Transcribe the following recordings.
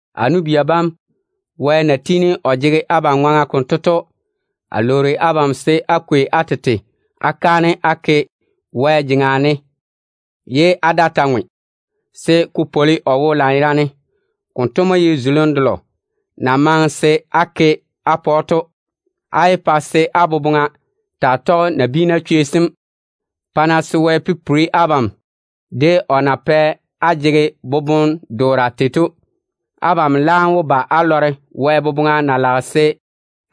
A nu-bia bam, Wɛ na tiini o jege abam ŋwaŋa konto to, a lwoori abam se á kwei á tete á ke kaanem á pa Wɛ ye á daa ta ŋwe, se ko pwoli o wo lanyerane. Konto mo ye zulim delo na maŋe se á ke á pa‑o to. Á yé pa se á boboŋa taa tɔge nabiina chwei sem. Pa-na se Wɛ pipiri abam de o na pɛ á jege boboŋ-doora tei to. Abam laam wó ba á lɔre Wɛ boboŋa na lage se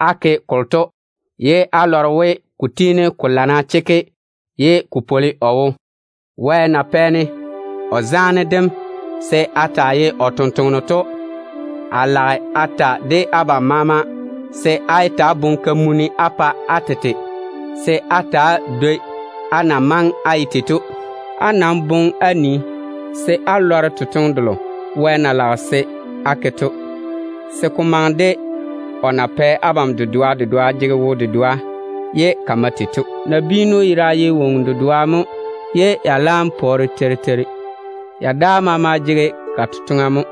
á ke kolo to, ye á lɔre we ko tiini ko lana chekke ye ko pwoli o wo. Wɛ na pɛ-ne o zaane dem se a taa ye o tontoŋeno to, a lage a ta de abam maama se á yé ta‑á boŋe kamunim á pa á tete se á ta‑á dwoi á na maŋe á ye tei to. Á nam boŋe á nii se á lɔre totoŋe delo Wɛ na lage se á ke to, se ko maŋe de o na pɛ abam dedoa dedoa jege wo-dedoa ye ka mae tei to. Nabiinu yera ye woŋo dedoa mo ye ya laam pɔɔre teiri teiri. Ya daa maama jege ka totoŋa mo.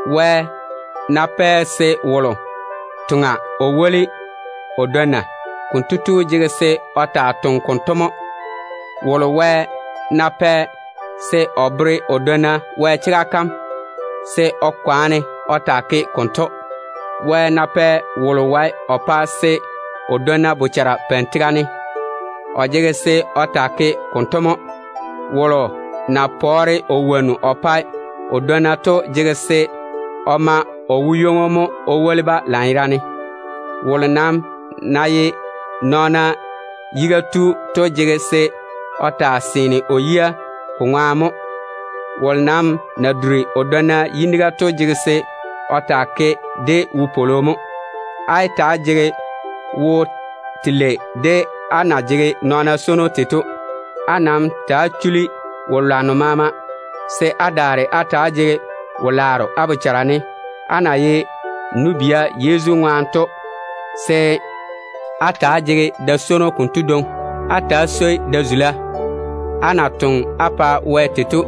Wɛ ná pɛ wolo toŋa o woli o dwonna, konto tu jege se o taa toŋa konto mo. Wolo Wɛ ná pɛ se o bere o dwonna Wɛ chega kam, se o kwaane o taa ke konto. Wɛ ná pɛ wolo wae o pa se o dwonna bochara peini tega ne, o jege se o taa ke konto mo. Wolo na pɔɔre o wonnu o pae o dwonna to jege se o ma o wo-ywoŋo mo o woli-ba lanyerane. Wolo nam na ye nɔɔna yiga tu to jege se o taa seene o yia ko ŋwaane mo. Wolo nam na duri o dwonna yiniga to jege se o taa ke de wopwolo mo. Á yé ta‑á jege ni-zɛ ni-zɛ de á na jege nɔɔna swono tei to. Nam ta‑á chuli-na wo-lwanno maama, se á daare á ta‑á jege wo-laaro á bochara ne. Á na ye nu-bia Yezu ŋwaane to, se á ta‑á jege da-swono konto dwoŋi. Á ta ta‑á swoi da-zula. Á na toŋe á pa Wɛ tei to,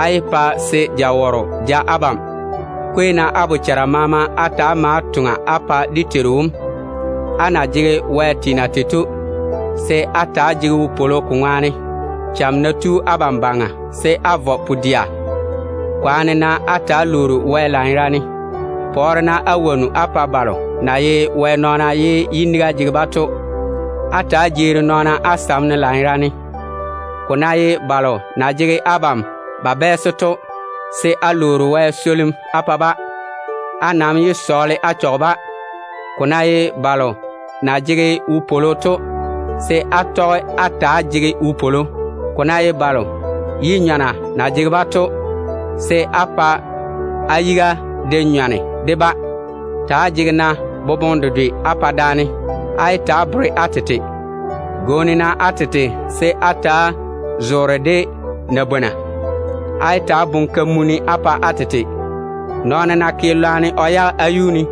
á yé pa se jawɔrɔ ja abam. Kwei-na á bochara maama á ta‑á ma á toŋa á pa dé Teiru wom. Á na jege Wɛ teena tei to, se á ta‑á jege wopwolo ko ŋwaane. Cham ná tu abam baŋa, se á vɔ pu-dɛa. Kwaane-na á ta‑á lwoori Wɛ lanyerane. Pɔɔre-na á wonnu á pa balo na ye Wɛ nɔɔna ye yiniga jege-ba to. Ta‑á jeeri-na nɔɔna á sam ne lanyerane. Ko ná ye balo na jege abam ba bɛɛse to, se á sɔɔle Wɛ swolim á pa-ba. Á nam yé sɔɔle lwarem á chɔge-ba. Ko ná ye balo na jege wopwolo to, se á tɔge á ta‑á jege wopwolo. Ko ná ye balo yi-nyɔna na jege-ba to, se á pa á yiga de nyɔne de-ba. Ta‑á jege-na boboŋe dedwe á pa daane. Á yé ta‑á bere á tete. Gwooni-na á tete se á ta‑á zoore de nabwona. Á yé ta‑á boŋe kamunim á pa á tete. Nɔɔno ná ke lwarem o yage á yuu ne,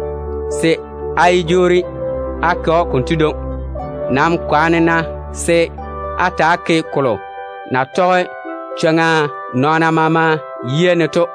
se á yé jwoori á ke‑o konto dwoŋi. Nam kwaane-na se á ta‑á ke kolo na tɔge chwoŋa nɔɔna maama yia ne to.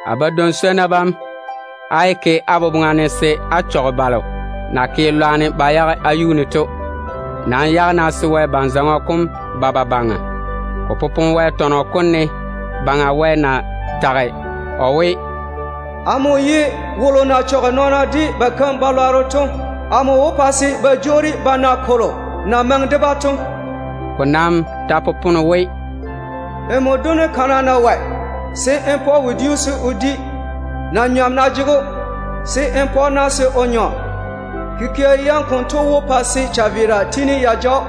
A badwoŋ-swonnu bam, á yé ke á boboŋa ne se á jwoori á chɔge balo na ke lwarem ba yage á yuu ne to. Nam yage-na se Wɛ ban-zɔŋɔ kom ba ba baŋa. Ko popone Wɛ tɔnɔ kom ne we: “Amo Baŋa Wɛ mo wó jwoori a ŋwe nɔɔna keim-balwaaro jene, pa se ba na kolo na maŋe de-ba to.” Ko nam ta popone we: “Nmo dono kana ná wɔe, se n pa‑o wodiu se o di. Na-nyɔm ná jege‑o, se n pa‑o na se o nyɔ. Kikia yam konto wó pa se chaveera tiini ya ja‑o,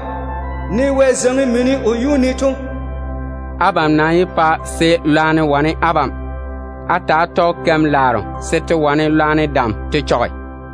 ne Wɛ zeiŋi mini mo o yuu ne to.” Abam nam yé pa se lwarem wane abam. Ta‑á tɔge-na keim-laaro se te wane lwarem dam te chɔge.